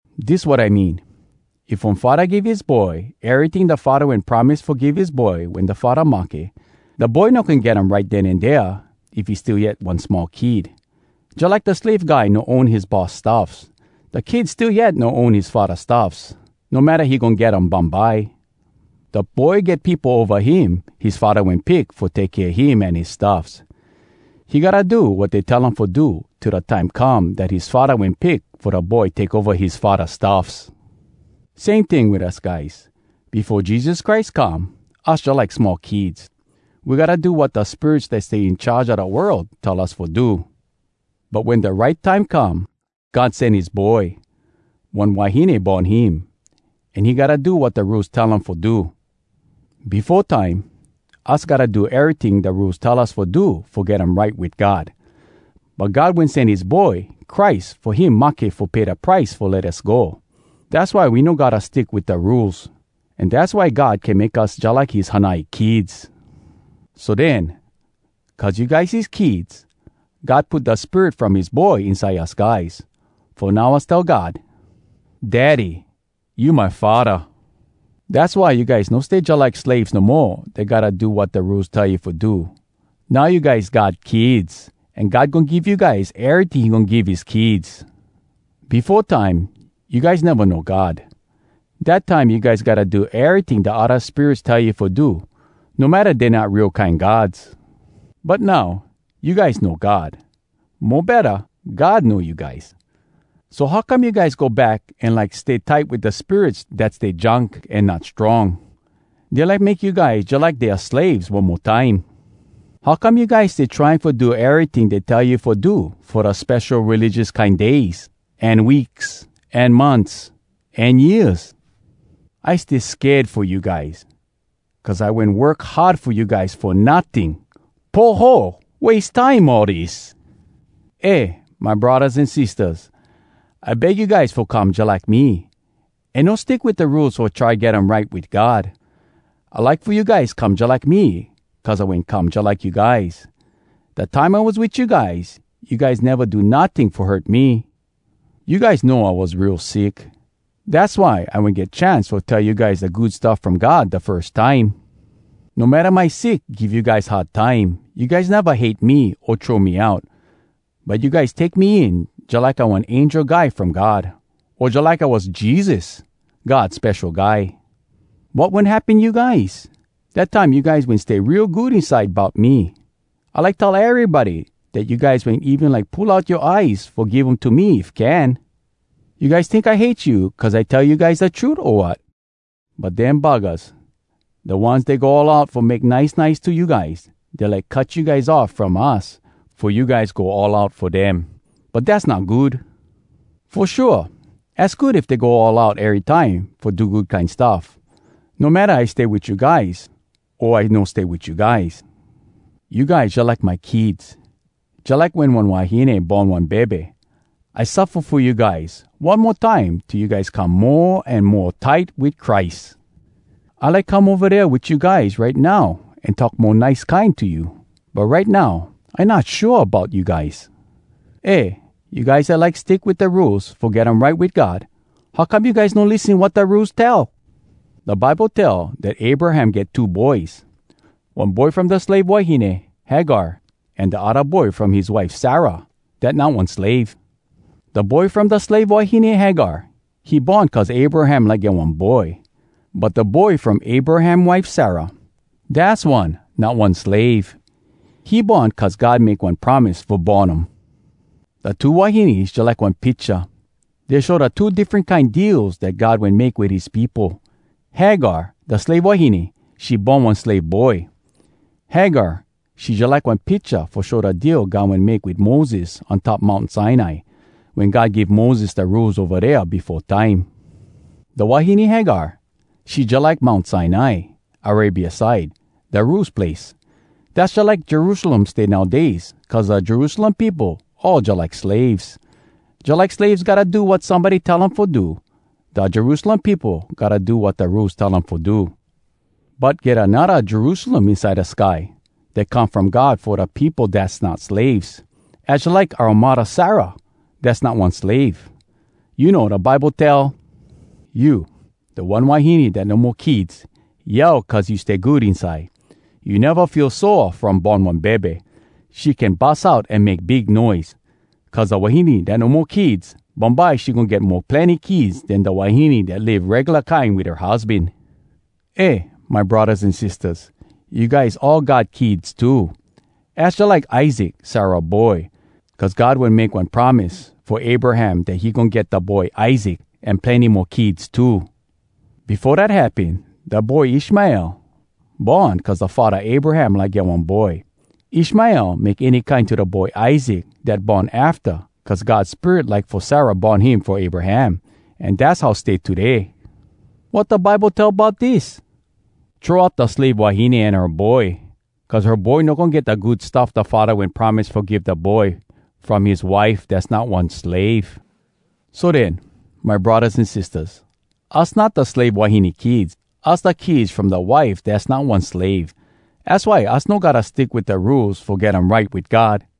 Dis wat I mean. If one faddah give his boy eryting da faddah wen promise fo give his boy wen da faddah mahke, da boy no can get um right den an dea if he still yet one small kid. Jalike da slave guy no own his boss stuffs, da kid still yet no own his faddah stuffs, no matta he goin get um bumbye. Da boy get peopo ova him his faddah wen pick fo take kea him an his stuffs. He gotta do wat dey tell um fo do till da time come dat his faddah wen pick fo da boy take ova his faddah stuffs. Same ting wit us guys. Befo Jesus Christ come, us jalike small kids. We gotta do wat da spirits dat stay in charge a da world tell us fo do. But wen da right time come, God sen his Boy. One wahine born him, an he gotta do wat da Rules tell um fo do. Befo time, us gotta do eryting da Rules tell us fo do fo get um right wit God. But God wen sen his Boy Christ fo him mahke fo pay da price fo let us go. Dass why we no gotta stick wit da Rules. An dass why God can make us jalike his hanai kids. So den, cuz you guys his kids, God put da Spirit from his Boy inside us guys, fo now us tell God, “Daddy, you my Faddah!” Dass why you guys no stay jalike slaves no mo dat gotta do wat da Rules tell you fo do. Now you guys God kids! An God goin give you guys eryting he goin give his kids. Befo time you guys neva know God. Dat time you guys gotta do eryting da odda spirits tell you fo do, no matta dey not real kine gods. But now, you guys know God. Mo betta, God know you guys. So how come you guys go back an like stay tight wit da spirits dat stay junk an not strong? Dey like make you guys jalike dea slaves one mo time. How come you guys stay trying fo do eryting dey tell you fo do fo da spesho religious kine days, an weeks, an months, an years? I stay sked fo you guys, cuz I wen work hard fo you guys fo notting. Poho! Wase time all dis! Eh, my braddahs an sistahs, I beg you guys fo come jalike me, an no stick wit da Rules fo try get um right wit God. I like fo you guys come jalike me cuz I wen come jalike you guys. Da time I was wit you guys, you guys neva do notting fo hurt me. You guys know I was real sick. Dass why I wen get chance fo tell you guys da Good Stuff From God da firs time. No matta my sick give you guys hard time, you guys neva hate me o throw me out. But you guys take me in jalike I one angel guy from God, o jalike I was Jesus, God Spesho Guy. Wat wen happen you guys? Dat time you guys wen stay real good inside bout me. I like tell erybody dat you guys wen even like pull out yoa eyes fo give um to me if can. You guys tink I hate you cuz I tell you guys da trut, o wat? But dem buggahs, da ones dey go all out fo make nice nice to you guys, dey like cut you guys off from us, fo you guys go all out fo dem. But dass not good. Fo shua, az good if dey go all out erytime fo do good kine stuff, no matta I stay wit you guys o I no stay wit you guys. You guys jalike my kids. Jalike wen one wahine born one bebe, I suffa fo you guys one mo time till you guys come mo an mo tight wit Christ. I like come ova dea wit you guys right now an talk mo nice kine to you. But right now, I not shua bout you guys. Eh, you guys dat like stick wit da Rules fo get um right wit God, how come you guys no lissen wat da Rules tell? Da Bible tell dat Abraham get two boys, one boy from da slave wahine Hagar an da odda boy from his wife Sarah dat not one slave. Da boy from da slave wahine Hagar, he born cuz Abraham like get one boy. But da boy from Abraham wife Sarah dass one not one slave. He born cuz God make one promise fo born um. Da two wahines jalike one picha. Dey show da two diffren kine deals dat God wen make wit his peopo. Hagar, da slave wahine, she born one slave boy. Hagar, she jalike one picha fo show da deal God wen make wit Moses on top Mount Sinai, wen God give Moses da Rules ova dea befo time. Da wahine Hagar, she jalike Mount Sinai, Arabia side, da Rules place. Dass jalike Jerusalem stay nowdays cuz da Jerusalem peopo all jalike slaves. Jalike slaves gotta do wat somebody tell um fo do, da Jerusalem peopo gotta do wat da Rules tell um fo do. But get anodda Jerusalem inside da sky, dat come from God fo da peopo dass not slaves. Az jalike oua muddah Sarah, dass not one slave. You know, da Bible tell, “You, da one wahine dat no mo kids, Yell cuz you stay good inside. You neva feel sore from born one bebe. She can bus out an make big noise. Cuz da wahine dat no mo kids, Bumbye she goin get mo plenny kids Den da wahine dat live regula kine wit her husban.” Eh, my braddahs an sistahs, you guys all God kids too. Az jalike Isaac, Sarah boy, cuz God wen make one promise fo Abraham dat he goin get da boy Isaac an plenny mo kids too. Befo dat happen, da boy Ishmael born cuz da faddah Abraham like get one boy. Ishmael make any kine to da boy Isaac dat born afta cuz God Spirit like fo Sarah born him fo Abraham. An dass how stay today. Wat da Bible tell bout dis? “Throw out da slave wahine an her boy cuz her boy no goin get da good stuff da faddah wen promise fo give da boy from his wife dass not one slave.” So den, my braddahs an sistahs, us not da slave wahine kids. Us da kids from da wife dass not one slave. Az why us no gotta stick wit da Rules fo get um right wit God.